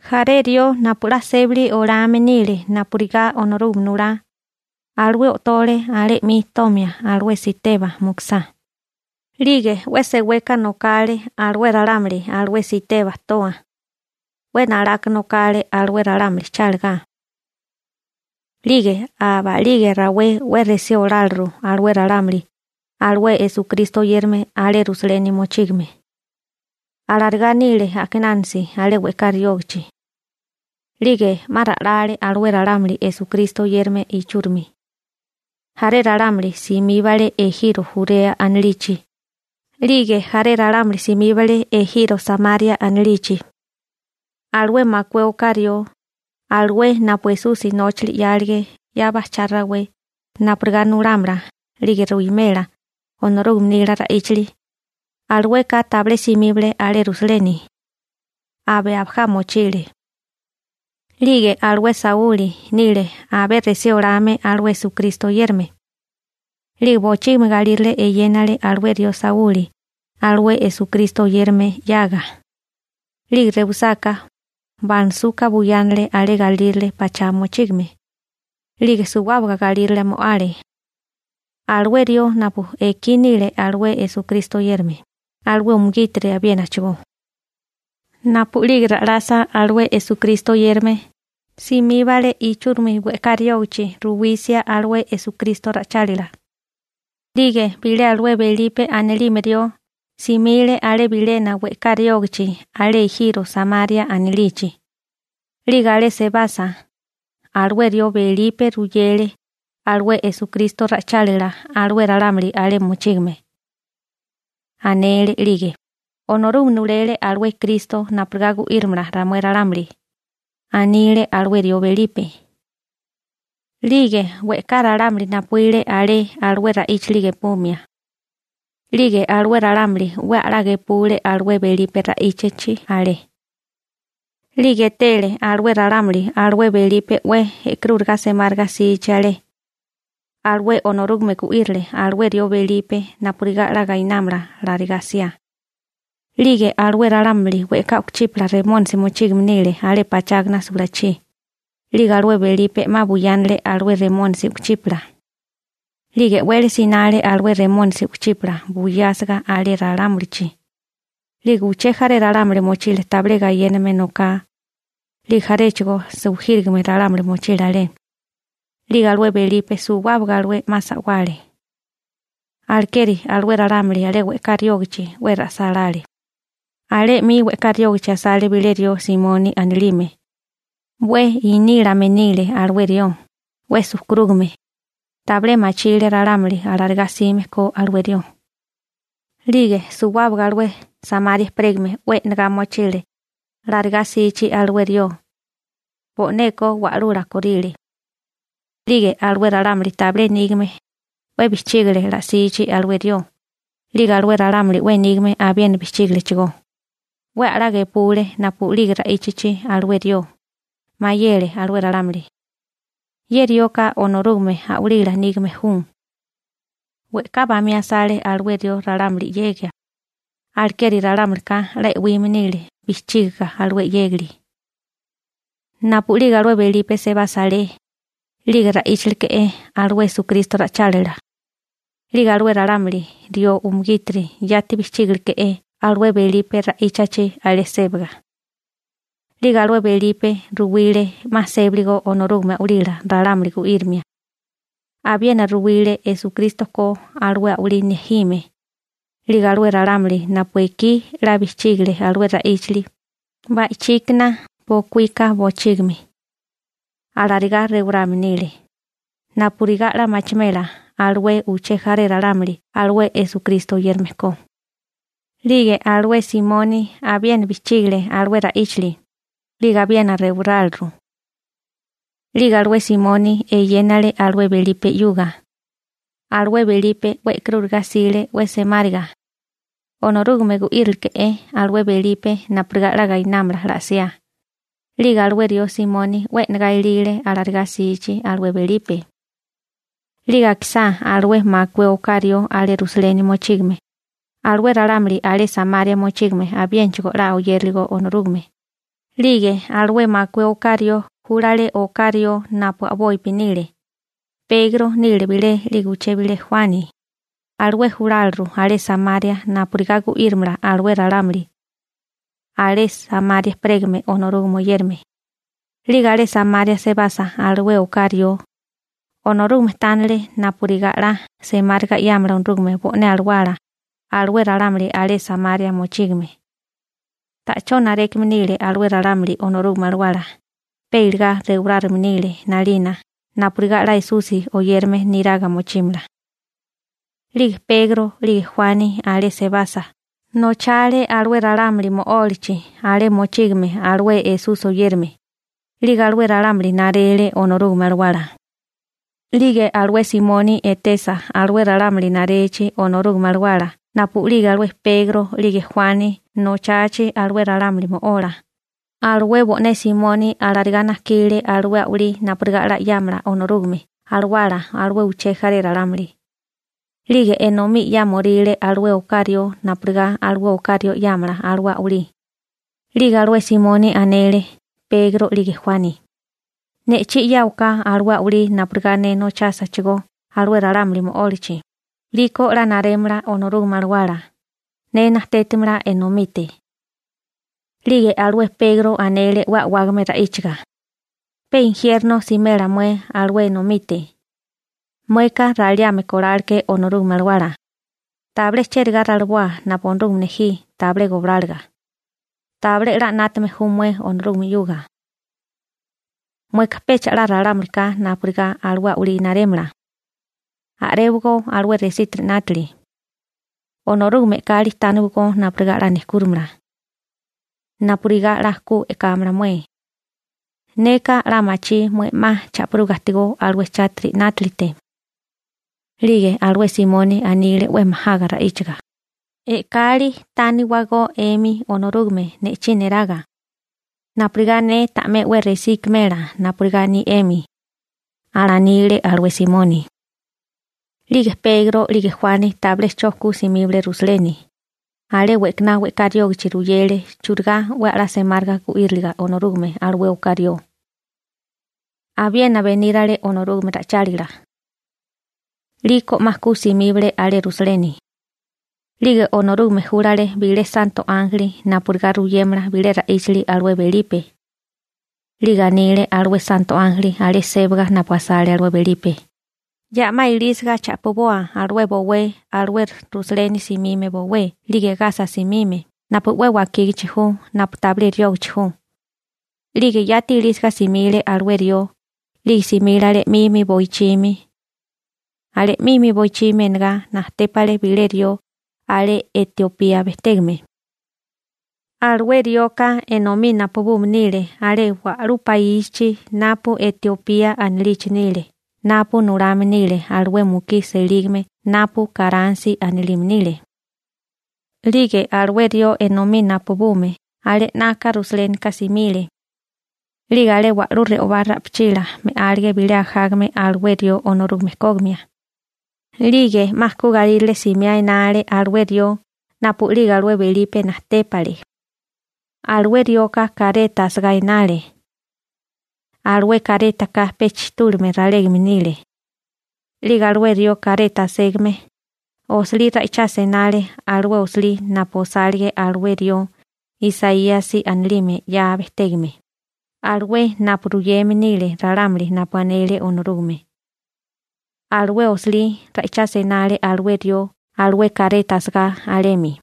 Jaré rió napu 'la sébali olame nile napurigá Onorúgame nulá, alué o'tole alé 'mi tomia alué Siteba mukusá. 'Lige 'we seweka nokale alué ralámuli alué Siteba toa. 'We nalaka nokale alué ralámuli chálagá. 'Lige aba'lige rawé 'we resí oláleru alué ralámuli alué Esukristo oyérame alé Rusaleni mochígame. Alarigá nile a'kinánasi alé we'ká riógichi. 'Lige 'ma ra'lale alué ralámuli Esukristo oyérame ichúrimi. Jaré ralámuli simíbale ejiro Jurea anilichi 'lige jaré ralámuli simíbale ejiro Samaria anilichi. Alué makué oká rió, alué napu Esusi nóchili 'yálige 'ya bajchá rawé napurigá nulámala 'lige ruwimela Onorúgame nila ra'íchali, alueka tabilé simíbale alé Rusaleni, abe abajá mochile. 'Lige alué Sauli nile alué 'we resí olame alué Esukristo oyérame. 'Lige bochígimi galírale eyénale alué rió Sauli alué Esukristo oyérame 'yaga. 'Lige rewisáká, banasuka buyánale alé galírale pachá mochígame. 'Lige suwábaga galírale mo'ale alué rió napu ekí nile alué Esukristo oyérame, alué umugítiri abiénachigó. Napu'lige ra'lasa alué Esukristo oyérame, simíbale ichúrimi we'ká riógichi ruwisia alué Esukristo ra'ichálila. 'Lige bilé alué Belipe anilime rió simile alé bilena we'ká riógachi alé ejiro Samaria anilichi. 'Lige alé sebasa, alué rió Belipe ruyele alué Esukristo ra'ichálila alué ralámuli alé mochígame. Anele 'lige: ―Onorúgame nulele alué Kristo napurigá gu'írimala ramué ralámuli ―anile alué rió Belipe. 'Lige we'ká ralámuli napuíle alé alué ra'íchili gepumia. 'Lige alué ralámuli 'we a'lá gepule alué Belipe ra'íchachi alé. 'Lige etele alué ralámuli alué Belipe 'we e'karúriga semáriga 'sichi alé. Alué Onorúgame gu'írile alué rió Belipe napurigá 'la gainámala alarigá 'siá. 'Lige alué ralámuli we'ká u'kuchípala remónisi mochígame nile alé pachágana sulachí. 'Lige alué Belipe 'ma buyánale alué remónisi u'kuchípala. 'Lige e'wele sinale alué remónisi u'kuchípala buyásiga alé ralámulichi. 'Lige uché jaré ralámuli mochile tabilé gayéname noká. 'Lige mochílechigó jaré ralámuli sujírigame alé. 'Lige alué Belipe suwábaga alué 'ma sa'wale. Alekeri alué ralámuli alé we'ká riógachi 'we ra'sálále. Alé 'mi we'ká riógichi asale bilé rió Simoni anilime. 'We inílame nile alué rió, 'we sujkurúgame. Tabilé machile ralámuli alarigá 'sime ko alué rió. 'Lige suwábaga alué Samaria ejperégame 'we e'nagá mochile alarigá 'sichi alué rió. Bo'neko wa'lula korile. 'Lige alué ralámuli tabilé nígame 'we bijchígale ala'sichi alué rió, 'lige alué ralámuli 'we nígame abiena bijchígalechigó. 'We a'lá gepule napu'lige ra'íchachi alué rió. Mayele alué ralámuli: ―Ye rioka Onorúgame a'walila nígame ju. We'ká bamí asale alué rió ralámuli 'yegia, alekeri ralámulika 'la e'wime nile bijchígaga alué 'yégali. Napu'lige alué Belipe sebasa alé, 'lige ra'íchaleke'é alué Esukristo ra'ichálila. 'Lige alué ralámuli rió umugítiri yati bijchígaleke'é alué Belipe ra'íchachi alé sébaga. 'Lige alué Belipe ruwile 'ma sébaligo Onorúgame a'walila ralámuli gu'írimia. Abiena ruwile Esukristo ko alué a'walí nejime. 'Lige alué ralámuli napu ekí 'la bijchígale alué ra'íchili, ba'ichíkana bokuíka bochígimi, alarigá rewarame nile, napurigá 'la machimela alué uché jaré ralámuli alué Esukristo oyérame ko. 'Lige alué Simoni abiena bijchígile alué ra'íchili, 'lige abiena rewaráleru. 'Lige alué Simoni eyénale alué Belipe 'yuga. Alué Belipe 'we e'karúriga 'sile 'we semáriga. Onorúgame gu'írileke'é alué Belipe napurigá 'la gainámala 'la 'siá. 'Lige alué rió Simoni 'we e'negá ilile alarigá 'sichi alué Belipe. 'Lige akisá alué makué oká rió alé Rusaleni mochígame, alué ralámuli alé Samaria mochígame 'la oyéraligo Onorúgame, 'lige alué makué oká rió júlale oká rió napu a'bopi nile, Pegro nile bilé, 'lige uché bilé Juani, alué juláliru alé Samaria napurigá gu'írimala alué ralámuli alé Samaria ejperégame Onorúgame oyérame. 'Lige alé Samaria sebasa alué oká rió, Onorúgame tánele napurigá 'la semáriga 'yámala Onorúgame bo'né alawá alué ralámuli alé Samaria mochígame. Ta'chó narékame nile alué ralámuli Onorúgame Alawala, pe iligá rewarárigame nile 'nalina napurigá 'la Esusi oyérame niraga mochímala. 'Lige Pegro 'lige Juani, alé sebasa, nochale alué ralámuli mo'ólachi alé mochígame alué Esusi oyérame, 'lige alué ralámuli narele Onorúgame Alawala. 'Lige alué Simoni etesa alué ralámuli narechi Onorúgame Alawala napu'lige alué Pegro 'lige Juani nochachi alué ralámuli mo'ola, alué bo'né Simoni alarigá najkile alué a'walí napurigá 'la 'yámala Onorúgame Alawala alué uché jaré ralámuli. 'Lige enomí 'yámoríle alué oká rió napurigá alué oká rió 'yámala alué a'walí. 'Lige alué Simoni anele Pegro 'lige Juani: ―Ne'chí 'yáwaká alué a'walí napurigá ne nochásachigó alué ralámuli mo'ólachi, 'liko 'la narémala Onorúgame Alawala. Ne najtétimala enomite. 'Lige alué Pegro anele 'we a'wágame ra'íchaga: ―¡Pe injierno simela mué alué enomite, mueka raliame koláleké Onorúgame Alawala! ¡Tabilé chérigá raliboa napu Onorúgame nejí tabilé gobláliga! Tabilé 'la 'nátame ju mué Onorúgame 'yuga. Mueka pecha 'la ralámulika napurigá alué a'walí narémala. A'réwagó alué resítiri 'nátili. Onorúgame e'kali tániwagó napurigá 'la nejkúrimala napurigá 'la ku e'kámala mué. Neka 'la machí mué 'ma cha'piruga ajtigó alué chátiri 'nátalite. 'Lige alué Simoni anile 'we majaga ra'íchaga: ―E'kali tániwagó 'emi Onorúgame ne'chí neraga napurigá ne ta'mé 'we resí ikimela napurigá aní 'emi ―alanile alué Simoni. 'Lige Pegro 'lige Juani tabilé 'cho ku simíbale Rusaleni, alé we'kaná we'ká riógachi ruyele churigá 'we a'lá semáriga gu'íriliga Onorúgame alué oká rió. Abiena benírale Onorúgame ra'ichálila. 'Liko 'ma ku simíbale alé Rusaleni. 'Lige Onorúgame júlale bilé santo ánjeli napurigá ruyémala bilé ra'íchali alué Belipe. 'Lige anile alué santo ánjeli alé sébaga napu asale alué Belipe: ―Ya'má ilísiga cha'piboa alué bowé alué Rusaleni simime bowé 'lige Gasa simime napu 'we wakígichi ju napu tabilé riógachi ju. 'Lige yati ilísiga simile alué rió, 'lige simile alé 'mimi boichimi. Alé 'mimi boichimi enagá najtépale bilé rió alé Etiopía bejtégame. Alué rioka enomí napubume nile alé wa'lú paísichi napu Etiopía anilichi nile napu nulame nile alué mukí selígame napu Kanrasi anilime nile. 'Lige alué rió enomí napubume alé 'naka Rusalénika simile. 'Lige alé wa'lú re'obá ra'pichila me'álige bilé ajágame alué rió Onorúgame kógimia. 'Lige 'ma ku galírale simiá enale alué rió napu'lige alué Belipe najtépale. Alué rioka kareta asagá enale. Alué karétaka pe chitúlame ralégame nile. 'Lige alué rió kareta aségame, osilí ra'ichasia enale alué osilí napu osálige alué rió Isaíasi anilime 'ya bejtégame, alué napu ruyeme nile ralámuli napu anele Onorúgame. Alué osilí ra'ichasia enale alué rió alué kareta asegá alemi.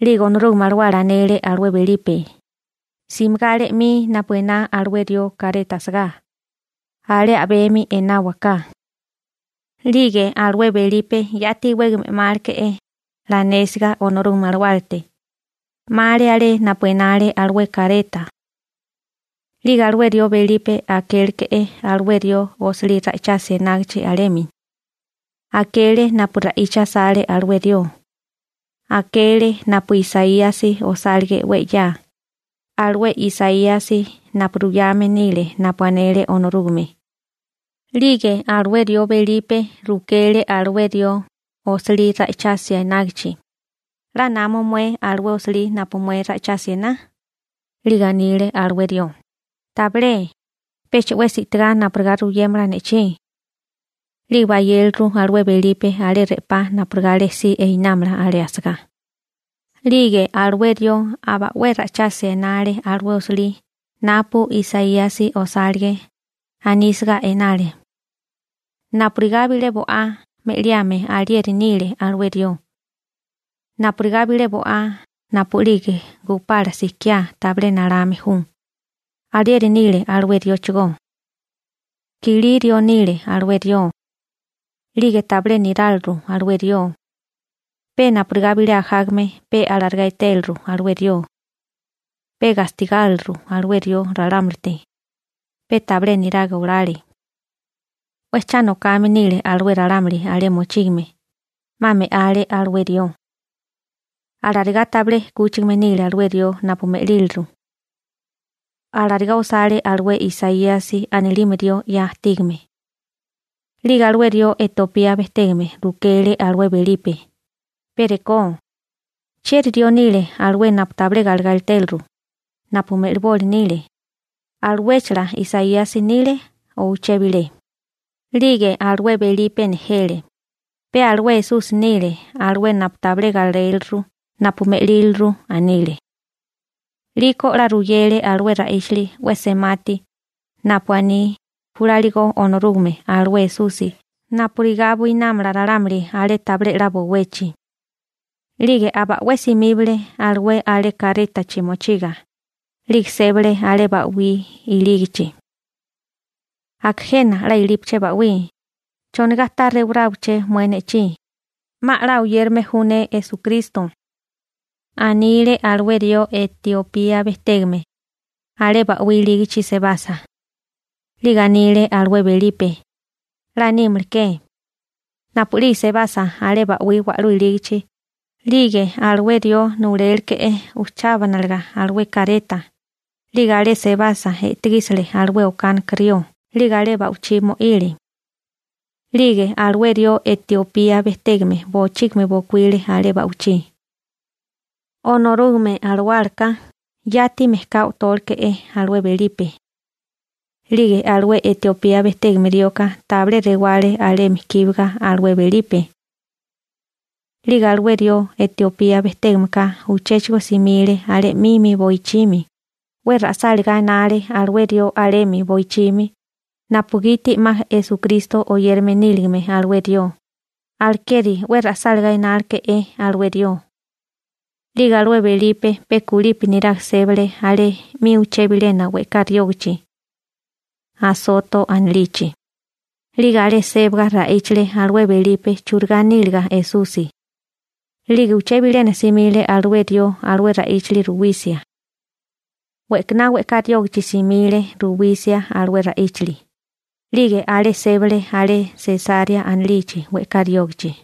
'Lige Onorúgame Alawala anele alué Belipe: ―Simigá alé 'mi napu ená alué rió kareta asagá, alé a'bemi enáwaká. 'Lige alué Belipe yati iwégame 'máleke'é 'la anésiga Onorúgame Alawálate, 'male alé napu enale alué kareta. 'Lige alué rió Belipe akéleke'é alué rió osilí ra'ichasia enágichi alemi. Akele napu ra'icha asale alué rió. Akele napu Isaíasi osálige 'we 'ya, alué Isaíasi napu ruyame nile napu anele Onorúgame. 'Lige alué rió Belipe rukele alué rió osilí ra'ichasia enágichi: ―¿'La namo mué alué osilí napu mué ra'íchasia ená? 'Lige anile alué rió: ―Tabilé, pecha 'wesi i'tigá napurigá ruyémala ne'chí. 'Lige bayéleru alué Belipe alé re'pá napurigá alé si enámala alé asagá. 'Lige alué rió aba 'we ra'ichasia enale alué osilí napu Isaíasi osálige, anísiga enale: Napurigá bilé bo'á me'liame alieri nile alué rió. Napurigá bilé bo'á napu'lige gupala sikiá tabilé nalame ju, alieri nile alué rióchigó. Kilí rió nile alué rió. 'Lige tabilé niráliru alué rió, pe napurigá bilé ajágame pe alarigá etéliru alué rió. Pe gastigáriliru alué rió ralámulite, pe tabilé niraga olale. 'We cha nokame nile alué ralámuli alé mochígame. 'Ma me'ale alué rió. Alarigá tabilé 'kúchigame nile alué rió napu me'líliru. Alarigá osale alué Isaíasi anilime rió 'ya ajtígame. 'Lige alué rió Etiopía bejtégame rukele alué Belipe: ―Pe rekó, ¿chieri rió nile alué napu tabilé galegá etéliru, napu me'liboli nile? ¿Aluéchala Isaíasi nile, o uché bilé nile? 'Lige alué Belipe nejele: ―Pe alué Esusi nile alué napu tabilé galéliru napu me'líliru ―anile. 'Liko 'la ruyele alué ra'íchali 'we semati napu aní júlaligo Onorúgame alué Esusi napurigá buinámala ralámuli alé tabilé 'la bowechi. 'Lige aba 'we simíbale alué alé karétachi mochiga, 'lige sébale alé ba'wí ilígichi. ―Aka jena 'la ilípaché ba'wí, ¿chonigá ta rewaráwabaché mué ne'chí? 'Ma 'la oyérame ju ne Esukristo ―anile alué rió Etiopía bejtégame alé ba'wí ilígichi sebasa. 'Lige anile alué Belipe: ―'La nímaleké. Napu'lige sebasa alé ba'wí wa'lú ilígichi, 'lige alué rió nuláleke'é ujchábanalaga alué kareta. 'Lige alé sebasa e'tegísile alué okánika rió 'lige alé ba'wichí mo'ile. 'Lige alué rió Etiopía bejtégame bochígimi bokuíle alé ba'wichí. Onorúgame Alawálaka yati mejká o'tóleke'é alué Belipe. 'Lige alué Etiopía bejtégame rioka tabilé rewale alemi kíbaga alué Belipe. 'Lige alué rió Etiopía bejtégameka uchéchigo simile alé 'mimi boichimi, 'we ra'sálagá enale alué rió alemi boichimi napugiti 'ma Esukristo oyérame níligame alué rió, alekeri 'we ra'sálagá enáleke'é alué rió. 'Lige alué Belipe pe kulipi niraga sébale alé 'mi uché bilena we'ká riógichi Asoto anilichi. 'Lige alé sébaga ra'íchale alué Belipe churigá níliga Esusi. 'Lige uché bilena simile alué rió alué ra'íchali ruwisia. We'kaná we'ká riógichi simile ruwisia alué ra'íchali, 'lige alé sébale alé Sesarea anilichi we'ká riógichi.